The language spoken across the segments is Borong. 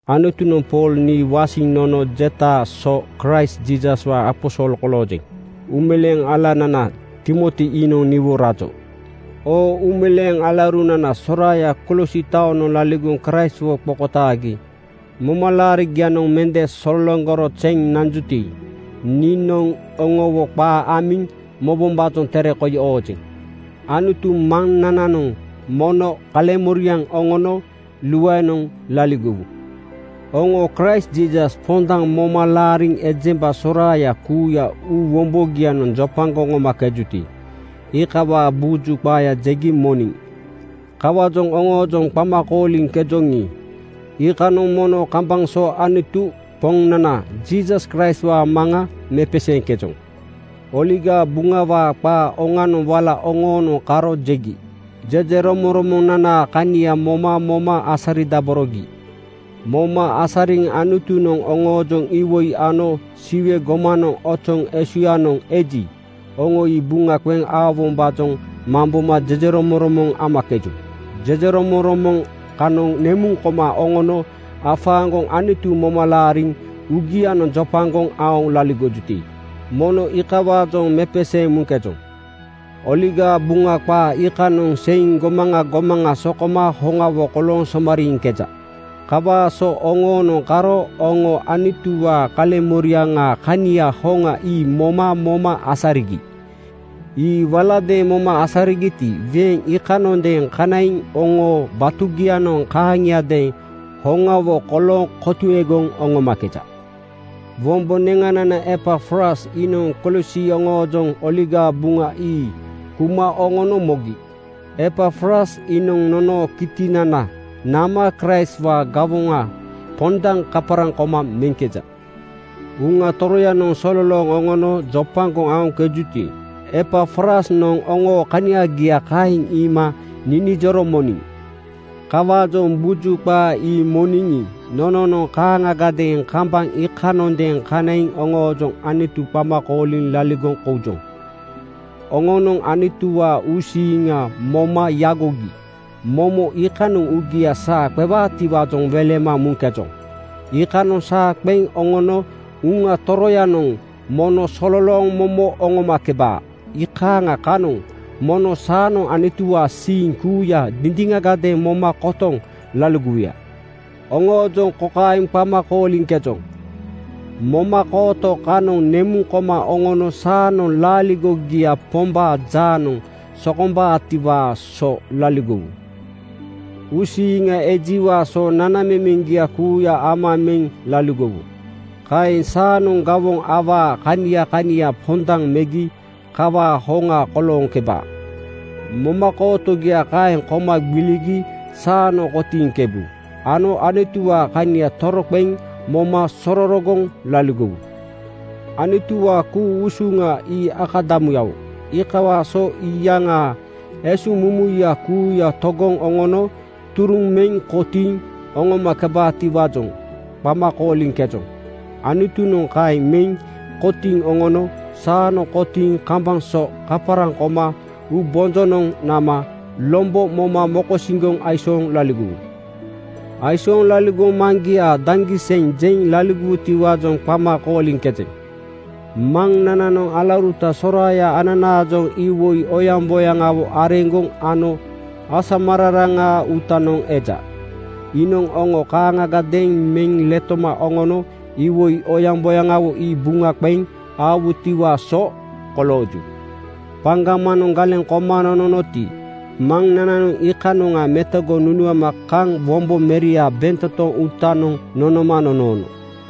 Anutunoŋ Pool nii wasiŋ nono jetaa so Kraist Jiisaswaa aposol koloojeŋ. Uumeleeŋ alanana Timoti iinoŋ niwo rajo. Oo uumeleeŋ alaurunana soraaya Kolosi taonoŋ laligoŋ Kraistwo qokotaagi momalaarigianoŋ mende sologoro zeŋ nanjuti, niinoŋ oŋowo qaa amiŋ mobombaajoŋ tere koi oojeŋ. Anutu Maŋnananoŋ mono kaleŋmoriaŋ oŋono luaenoŋ laligowu. Oŋo Kraist Jiisas pondaŋ moma laariŋ ejemba soraaya kuuya uu wombogianoŋ jopagoŋ oŋomakejuti, iikawaa buju qaaya jegi moniŋ. Kawaajoŋ oŋoojoŋ qama kooliŋkejoŋi, iikanoŋ mono kambaŋ so Anutu, Poŋnana Jiisas Kraistwaa Maŋa mepeseeŋkejoŋ. Oligaa Buŋawaa qaa oŋanoŋ wala oŋoonoŋ karo jegi jejeromoŋromonanaa kania moma moma asaridaborogi. Moma asariŋ Anutunoŋ oŋoojoŋ iwoi ano Siwe gomanoŋ ozoŋ esuŋnoŋ eji, oŋo ii buŋa qeŋ aowombaajoŋ mamboma jejeromoŋromoŋ amakeju. Jejeromoŋromoŋ kanoŋ nemuŋ koma oŋono afaaŋgoŋ Anutu moma laariŋ uugianoŋ jopagoŋ aoŋ laligojuti, mono iikawaajoŋ mepeseeŋ muŋkejoŋ. Oligaa Buŋa qaa iikanoŋ seiŋ gomaŋa gomaŋa sokoma hoŋawo kolooŋ somariiŋkeja. Kawaa so oŋoonoŋ karo oŋo Anutuwaa kaleŋmoriaŋaa kania hoŋa ii moma moma asarigi. Ii waladeeŋ moma asarigiti, weeŋ iikanoŋadeeŋ kanaiŋ oŋoo batugianoŋ kaaŋiadeeŋ hoŋawo kolooŋ kotuegoŋ oŋomakeja. Wombo neŋanana Epafras iinoŋ Kolosi oŋoojoŋ Oligaa Buŋa ii kuma oŋono mogi. Epafras iinoŋ nonoo kitinana nama Kraistwaa gawoŋa pondaŋ kaparaŋ koma meŋkeja. Uŋa Toroyanoŋ sololooŋ oŋono jopagoŋ aoŋkejuti, Epafrasnoŋ oŋoo kaniagia kaeŋ iima ninijoro moniŋ. Kawaajoŋ buju qaa ii moniŋi, nononoŋ kaaŋagadeeŋ kambaŋ iikanoŋadeeŋ kanaiŋ oŋoojoŋ Anutu qama kooliŋ laligoŋ koujoŋ. Oŋonoŋ Anutuwaa uusiiŋa moma yagogi momo iikanoŋ uugia saa qewaatiwaajoŋ welema muŋkejoŋ. Iikanoŋ saa qeŋ oŋono Uŋa Toroyanoŋ mono sololooŋ momo oŋomakebaa. Iikaaŋa kanoŋ mono saanoŋ Anutuwaa siiŋa kuuya dindiŋagadeeŋ moma kotoŋ laligowuya. Oŋoojoŋ kokaeŋ qama kooliŋkejoŋ: Momakooto kanoŋ nemuŋ koma oŋono saanoŋ laaligogia Pombaa jaanoŋ sokombaatiwaa so laligowu. Uusiiŋa ejiwaa so nanamemeŋgia kuuya ama meŋ laligowu. Kaeŋ saanoŋ gawoŋ awaa kania kania pondaŋ megi kawaa hoŋa kolooŋkeba. Momakootogia kaeŋ koma gbiligi saanoŋ kotiiŋkebu ano Anutuwaa kania toroqeŋ moma sororogoŋ laligowu. Anutuwaa ku-usuŋa ii akadamuyawo. Iikawaa so iyaŋaa esuŋmumuya kuuya togoŋ oŋono turuŋ meŋ kotiiŋ oŋomakebaatiwaajoŋ qama kooliŋkejoŋ. Anutunoŋ kaeŋ meŋ kotiiŋ oŋono saanoŋ kotiiŋ kambaŋ so kaparaŋ koma uubonjonoŋ nama lombo moma mokosiŋgoŋ aisooŋ laligowu. Aisooŋ laligoŋ Maŋgiaa daŋgiseŋ jeŋ laligowutiwaajoŋ qama kooliŋkejeŋ. Maŋnananoŋ alauruta soraaya ananaajoŋ iwoi oyamboyaŋawo areŋgoŋ ano asamararaŋaa uutanoŋ eja. Iinoŋ oŋo kaaŋagadeeŋ meŋ letoma oŋono iwoi oyamboyaŋawo ii buŋa qeŋ aowutiwaa so kolooju. Paŋgamanoŋ galeŋ koma nononoti, Maŋnananoŋ iikanoŋa metogoŋ nunuama kaŋ wombo Meriaa bentotoŋ uutanoŋ nonoma nonoono.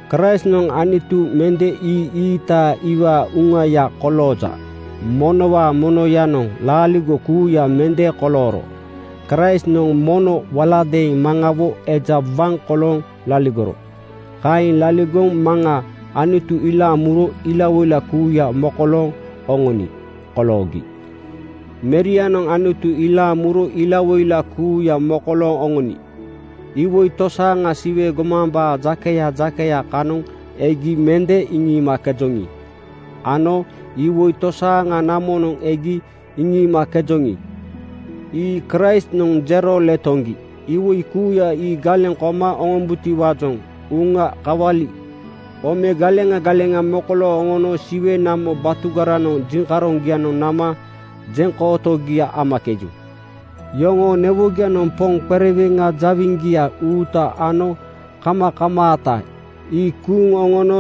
Kraistnoŋ Anutu mende ii-iita iwaa uŋauŋaya kolooja. Monowaa monoyanoŋ laaligo kuuya mende kolooro Kraistnoŋ mono waladeeŋ Maŋawo eja waŋ kolooŋ laligoro. Kaeŋ laligoŋ Maŋa Anutu ilaaŋ muro ilawoila kuuya mokolooŋ oŋoni koloogi. Merianoŋ Anutu ilaaŋ muro ilawoila kuuya mokolooŋ oŋoni. Iwoi tosaaŋa Siwe gomambaa jakeya jakeya kanoŋ egi mende iŋiimakejoŋi ano iwoi tosaaŋa namonoŋ egi iŋiimakejoŋi, ii Kraistnoŋ jero letoŋgi. Iwoi kuuya ii galeŋ koma oŋombutiwaajoŋ uŋa kawali (ome) galeŋa galeŋa mokolooŋ oŋono Siwe namo batugaranoŋ jiŋkaroŋgianoŋ nama jeŋkootogia amakeju. Yoŋoo newogianoŋ poŋ qereweŋa jawiŋgia uuta ano kamakamaata ii kuuŋ oŋono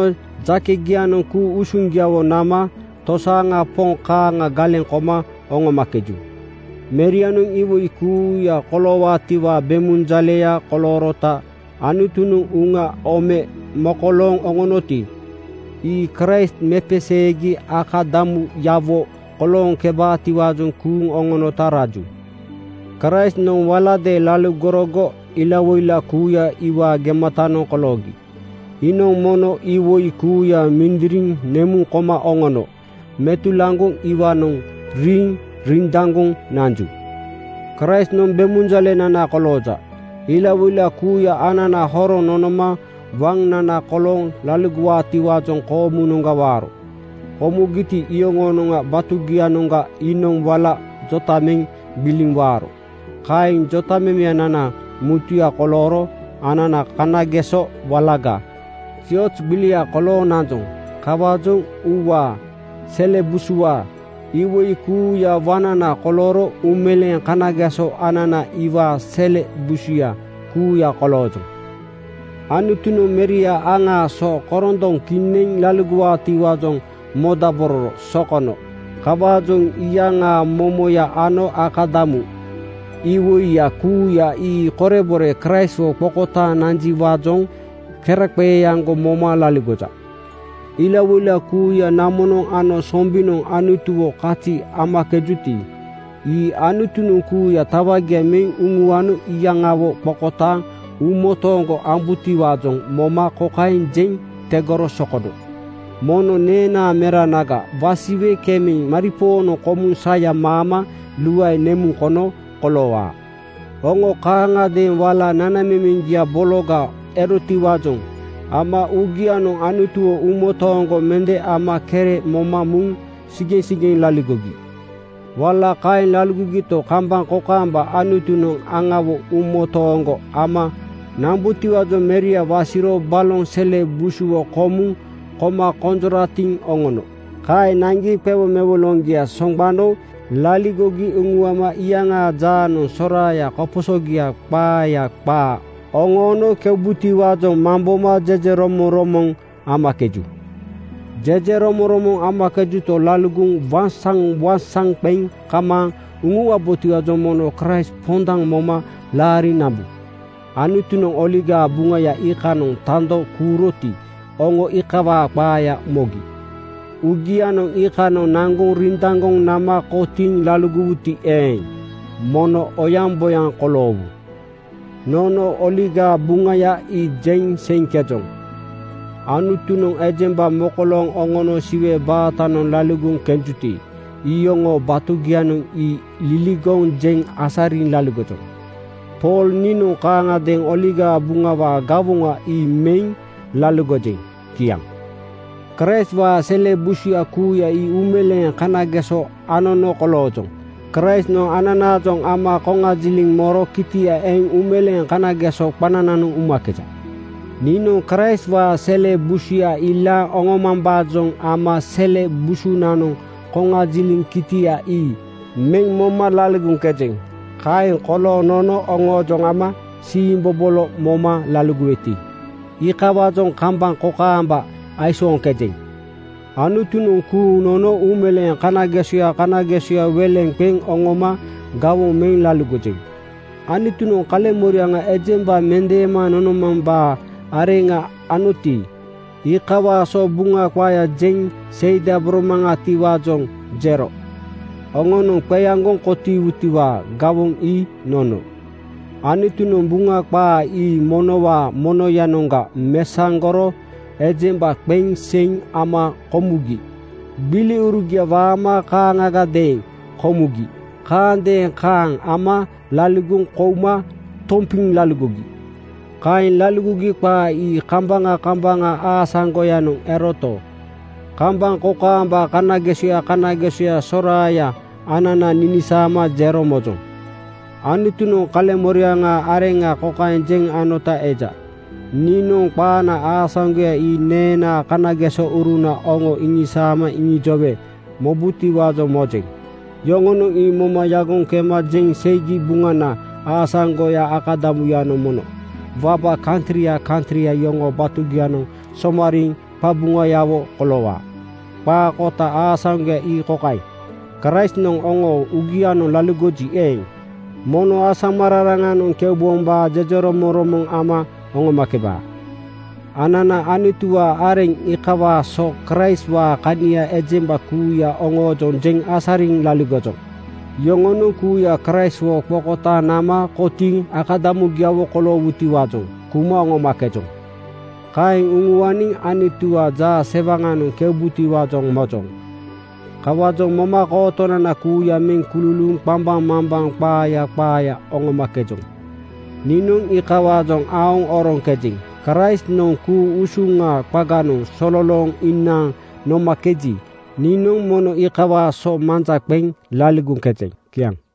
jakegianoŋ ku-usuŋgiawo nama tosaaŋa poŋ kaaŋa galeŋ koma oŋomakeju. Merianoŋ iwoi kuuya koloowaatiwaa bemunjaleya koloorota Anutunoŋ uŋa (ome) mokolooŋ oŋonoti, ii Kraist mepeseegi akadamuyawo kolooŋkebaatiwaajoŋ kuuŋ oŋonota raju. Kraistnoŋ waladeeŋ laligorogo ilawoila kuuya ii iwaa gematanoŋ koloogi. Iinoŋ mono iwoi kuuya mindiriŋ nemuŋ koma oŋono metulaŋgoŋ iwaanoŋ riiŋ rindaŋgoŋ nanju. Kraistnoŋ bemunjalenana kolooja. Ilawoila kuuya anana horoŋ nonoma waŋnana kolooŋ laligowaatiwaajoŋ koomunoŋga waaro. Komugiti, iyoŋoo batugianoŋga iinoŋ wala jota meŋ gbiliŋ waaro. Kaeŋ jotamemenana mutuya kolooro anana kanageso walagaa zioz gbilia kolooŋ nanjoŋ. Kawaajoŋ uuwaa, sele busuwaa, iwoi kuuyaa waŋnana kolooro uumeleeŋ kanageso anana iwaa sele busuya kuuya koloojoŋ. Anutunoŋ Meria aŋaa so korondoŋ kineŋ laligowaatiwaajoŋ modabororo sokono. Kawaajoŋ iyaŋaa momoya ano akadamu iwoiya kuuya ii korebore Kraistwo qokotaaŋ nanjiwaajoŋ keraqeeaŋgo moma laligoja. Ilawoila kuuya namonoŋ ano sombinoŋ Anutuwo kazi amakejuti, ii Anutunoŋ kuuya tawagia meŋ uŋuano iyaŋawo qokotaaŋ uumotooŋgo ambutiwaajoŋ moma kokaeŋ jeŋ tegoro sokono, “Mono neenaa Meranaga wasiwe kemeŋ maripoonoŋ komuŋ saya maama luae nemuŋ kono koloowaa.” Oŋo kaaŋagadeeŋ wala nanamemeŋgia bologa erotiwaajoŋ ama uugianoŋ Anutuwo uumotooŋgo mende ama kere moma muŋ sigeŋsigeŋ laligogi. Wala kaeŋ laligogito, kambaŋ kokaamba Anutunoŋ aŋawo uumotooŋgo ama nambutiwaajoŋ Meria wasiro baloŋ sele busuwo komuŋ koma konjoratiŋ oŋono. Kaeŋ naŋgi qewomewoloŋgia soŋgbano laligogi uŋuama iyaŋaa jaanoŋ soraaya koposogiaa qaaya qaa oŋoono keubutiwaajoŋ mamboma jejeromoŋromoŋ amakeju. Jejeromoŋromoŋ amakejuto, laligoŋ waŋsaŋwaŋsaŋ qeŋ kamaaŋ uŋuwabotiwaajoŋ mono Kraist pondaŋ moma laariŋ nambu. Anutunoŋ Oligaa Buŋaya iikanoŋ tando kuuroti, oŋo iikawaa qaaya mogi. Uugianoŋ iikanoŋ naŋgoŋ rindaŋgoŋ nama kotiiŋ laligowuti eeŋ, mono oyaŋboyaŋ koloowu. Nono Oligaa Buŋaya ii jeŋ seiŋkejoŋ. Anutunoŋ ejemba mokolooŋ oŋono Siwe baatanoŋ laligoŋ kenjuti, iyoŋoo batugianoŋ ii liligoŋ jeŋ asariŋ laligojoŋ. Pool niinoŋ kaaŋagadeeŋ Oligaa Buŋawaa gawoŋa ii meŋ laligojeŋ. Kiaŋ. Kraistwaa sele busuya kuuya ii uumeleeŋ kanageso anono koloojoŋ. Kraistnoŋ ananaajoŋ ama koŋajiliŋ moro kitia eŋ uumeleeŋ kanageso qanananoŋ umakeja. Niinoŋ Kraistwaa sele busuya ilaaŋ oŋomambaajoŋ ama sele busunanoŋ koŋajiliŋ kitia ii meŋ moma laligoŋkejeŋ. Kaeŋ kolooŋ nono oŋoojoŋ ama siimbobolo moma laligoweti, iikawaajoŋ kambaŋ kokaamba aisooŋkejeŋ. Anutunoŋ kuuŋ nono uumeleeŋ kanagesoya kanagesoya weleŋ qeŋ oŋoma gawoŋ meŋ laligojeŋ. Anutunoŋ kaleŋmoriaŋa ejemba mendeema nonomambaa areŋa anoti, iikawaa so Buŋa qaaya jeŋ seidaboromaŋatiwaajoŋ jero. Oŋonoŋ qeaŋgoŋ kotiiwutiwaa gawoŋ ii nono. Anutunoŋ Buŋa qaa ii monowaa monoyanoŋga mesaŋgoro ejemba qeŋ seiŋ ama komugi gbiliurugia waama kaaŋagadeeŋ komugi kaandeeŋ kaaŋ ama laligoŋ kouma tompiŋ laligogi. Kaeŋ laligogi qaa ii kambaŋa kambaŋa aasaŋgoyanoŋ eroto, kambaŋ kokaamba kanagesoya kanagesoya soraaya anana ninisaama jero mojoŋ. Anutunoŋ kaleŋmoriaŋaa areŋa kokaeŋ jeŋ anota eja, “Niinoŋ qaana aasaŋgoya ii neenaa kanagesouruna oŋo iŋisaama iŋijowe mobutiwaajoŋ mojeŋ. Yoŋonoŋ ii moma yagoŋ kema jeŋ seigi Buŋana aasaŋgoyaa akadamuyanoŋ mono waba kantria kantria yoŋoo batugianoŋ somariiŋ qaqabuŋayawo koloowaa.” Qaa kota aasaŋgoya ii kokaeŋ: Kraistnoŋ oŋoo uugianoŋ laligoji eeŋ, mono asamararanoŋ keubombaa jejeromoŋromoŋ ama oŋomakebaa. Anana Anutuwaa areŋ iikawaa so Kraistwaa kania ejemba kuuya oŋoojoŋ jeŋ asariŋ laligojoŋ. Yoŋonoŋ kuuya Kraistwo qokotaaŋ nama kotiiŋ akadamugiawo koloowutiwaajoŋ kuma oŋomakejoŋ. Kaeŋ uŋuaniŋ Anutuwaa jaasewaŋanoŋ keubutiwaajoŋ mojoŋ. Kawaajoŋ momakootonana kuuya meŋ kululuuŋ qambaŋmambaŋ qaaya qaaya oŋomakejoŋ. Niinoŋ iikawaajoŋ aoŋ oroŋkejeŋ. Kraistnoŋ ku-usuŋaa qaganoŋ sololooŋ inaaŋ nomakeji, niinoŋ mono iikawaa so manja qeŋ laligoŋkejeŋ. Kiaŋ.